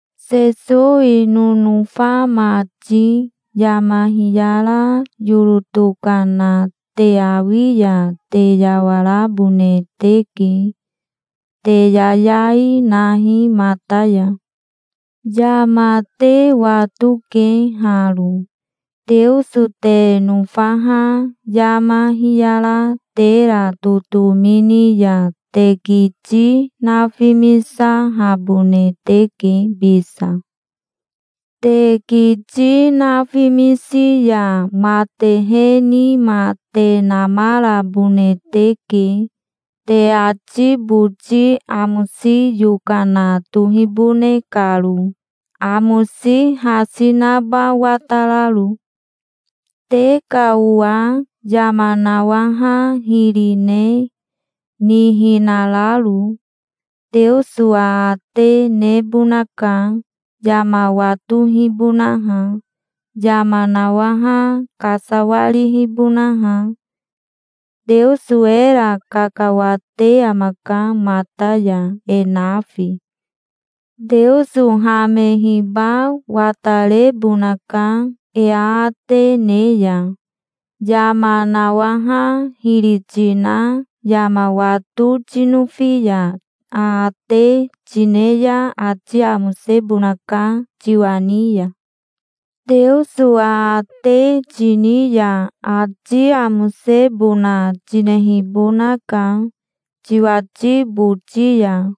Sesowi nonofa mati, yama hiyara yoro tokana te awi ya te yawarabone teke. Te yayai nahi mata ya. Yama te watoke haro: Teoso te nofaha yama hiyara tera totomi ni ya te kiti nafimisahabone teke bisa. Te kiti nafimisi ya matehe nima te namarabone teke, te ati boti amosi yokana tohibone karo, amosi hasi naba watararo. Te ka owa yama nawaha hiri ne, nihinararo, Teoso aate nebonaka, yama watohibonaha, yama nawaha kasawarihibonaha. Teoso era kakawate amaka mata ya, e nafi. Teoso hamehiba watarebonaka, e aate ne ya. Yama nawaha hiri tina yama wato tinofi ya aate tine ya ati amosebonaka tiwa ni ya. Teoso aate tini ya ati amosebona tinehibonaka tiwati boti ya.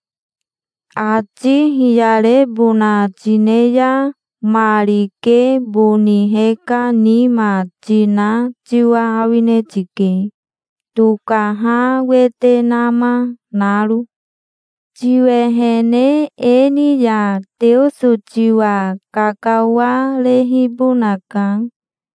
Ati hiyarebona tine ya ma rike boni heka nima tina tiwa awine tike, tokaha wete nama naro. Tiwehene e ni ya Teoso tiwa kakawarehibonaka,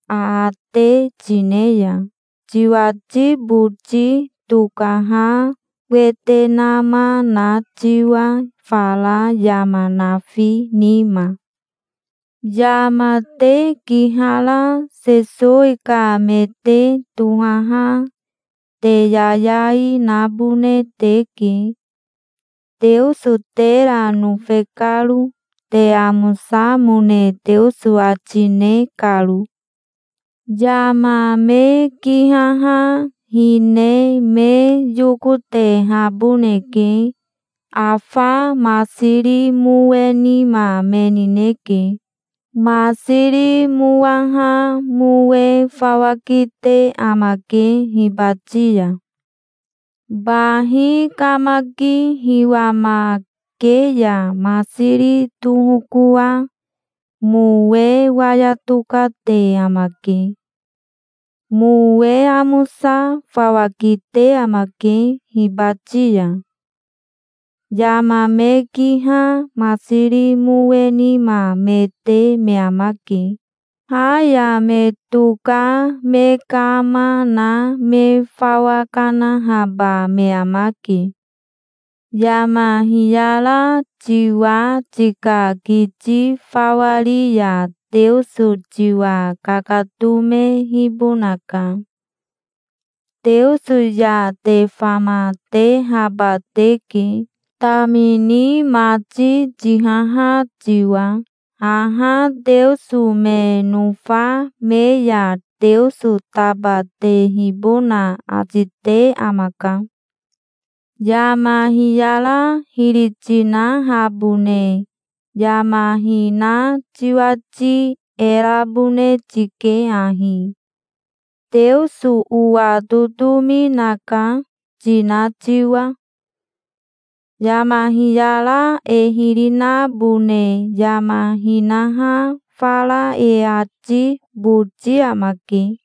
aate tine ya, tiwati boti tokaha wete nama na tiwa fara yama nafi nima. Yama te kihara Sesowi ka me te tohaha te yayai nabone teke, Teoso tera nofe karo, te amosamone Teoso ati ne karo. Yama me kihaha hine me yokotehaboneke. Afa masiri mowe nima me nineke. Masiri mowaha mowe fawa kite amake hibati ya. Bahi kamaki hiwamake ya masiri tohokoa mowe waya tokate amake. Mowe amosa fawa kite amake hibati ya. Yama me kiha masiri mowe nima me te me amake. Ha ya me toka me kama na me fawa kanahaba me amake. Yama hiyara tiwa tika kiti fawa ri ya Teoso tiwa kakatomehibonaka. Teoso ya te famatehaba teke, tamini mati tihaha tiwa. Haha Teoso me nofa me ya Teoso tabatehibona ati te amaka. Yama hiyara hiri tinahabone yama hina tiwati e rabone tike ahi, Teoso owa totomi naka, tina tiwa. Yama hiyara e hiri nabone yama hinaha fara e ati boti amake.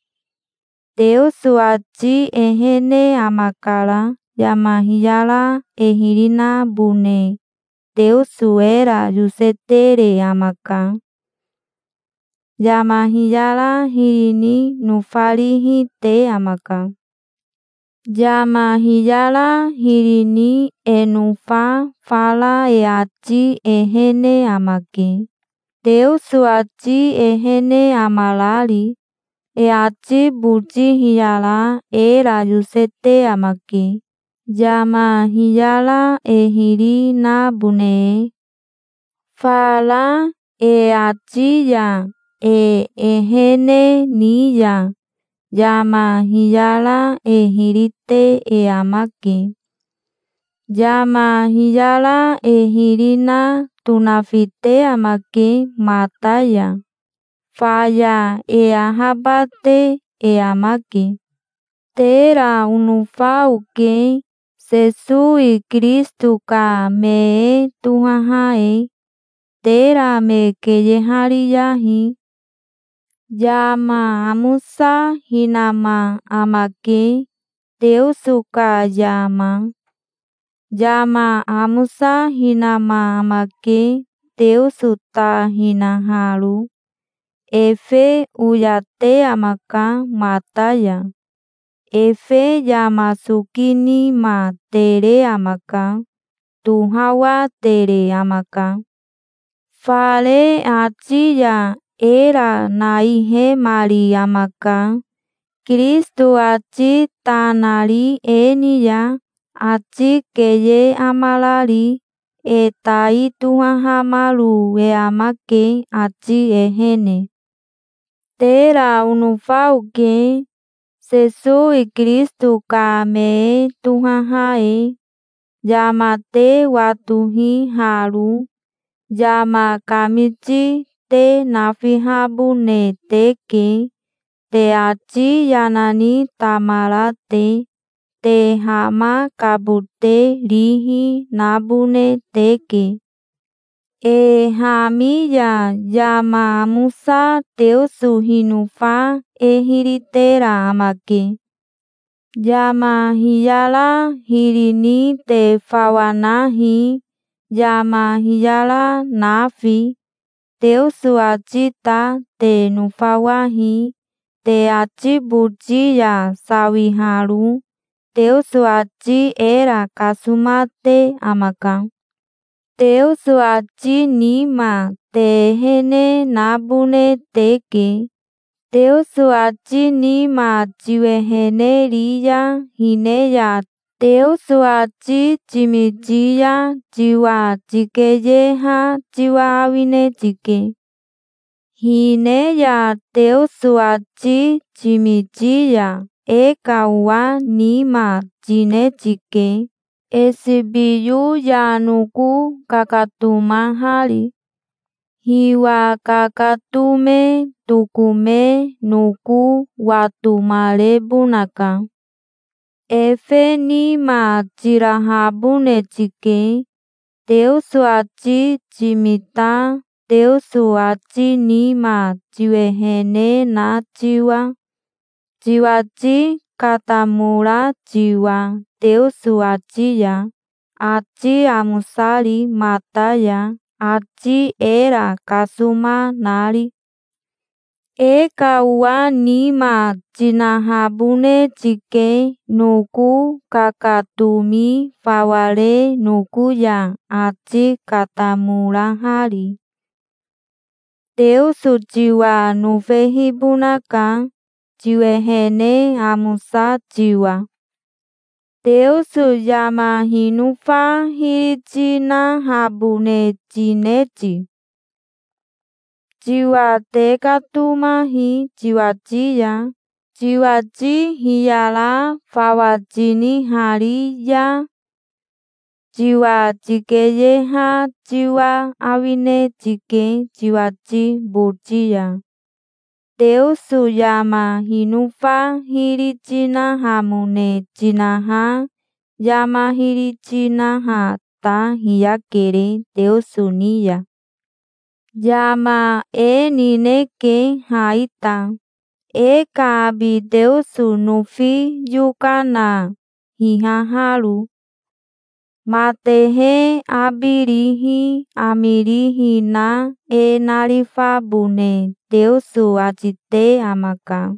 Teoso ati ehene amakara. Yama hiyara e hiri nabone Teoso era yosetere amaka. Yama hiyara hiri ni nofarihi te amaka. Yama hiyara hiri ni e nofa fara e ati ehene amake, Teoso ati ehene amarari. E ati boti hiyara era yosete amake, yama hiyara e hiri nabone e. Fara e ati ya e ehene ni ya yama hiyara e hiri te e amake. Yama hiyara e hiri na tonafite amake mata ya. Faya e ahabate e amake. Tera onofa oke, Sesowi Kirisito ka me e tohaha e. Tera me keyehariyahi. Yama amosa hinama amake, Teoso ka yama. Yama amosa hinama amake, Teoso ta hinaharo. Efe oyate amaka mata ya. Efe yama soki nima tere amaka. Tohawatere amaka. Fare ati ya era naihemari amaka, Kirisito ati ta nari e ni ya, ati keye amarari. E tai tohahamaro e amake, ati ehene. Tera onofa oke, Sesowi Kirisito ka me e tohaha e. Yama te watohi haro. Yama kamiti te nafihabone teke, te ati yana ni tamara te. Te hamakabote rihi nabone teke. E hami ya yama amosa Teoso hinofa e hiri tera amake. Yama hiyara hiri ni te fawa nahi, yama hiyara nafi. Teoso ati ta te nofawahi, te ati boti ya sawiharo. Teoso ati era kasomate amaka. Teoso ati nima te ehene nabone teke. Teoso ati nima tiwehene ri ya hine ya Teoso ati timiti ya tiwa tikeyeha tiwa awine tike. Hine ya Teoso ati timiti ya e ka owa nima tine tike, esibiyo ya noko kakatomahari. Hiwa kakatome tokome noko watomarebonaka. Efe nima tirahabone tike, Teoso ati timita Teoso ati nima tiwehene na tiwa, tiwati katamora tiwa Teoso ati ya, ati amosari mata ya, ati era kasoma nari. E ka owa nima tinahabone tike noko kakatomi fawa re noko ya ati katamorahari. Teoso tiwa nofehibonaka, tiwehene amosa tiwa. Teoso yama hinofa hiri tinahabone tine ti? Tiwa tekatomahi tiwati ya. Tiwati hiyara fawa tinihari ya, tiwa tikeyeha tiwa awine tike tiwati boti ya. Teoso yama hinofa hiri tinahamone tinaha yama hiri tinaha ta hiyakere Teoso ni ya. Yama e nineke ha ita, e ka abi Teoso nofi yokana hihaharo. Matehe abi rihi ami rihi na e narifabone Teoso ati te amaka.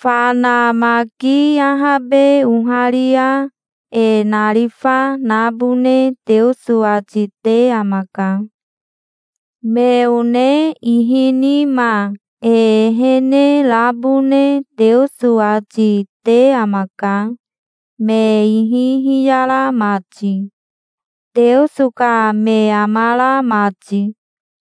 Fana maki ahabe oharia e narifa nabone Teoso ati te amaka. Me one ihi nima e ehene rabone Teoso ati, te amaka, me ihi hiyara mati, Teoso ka me amara mati.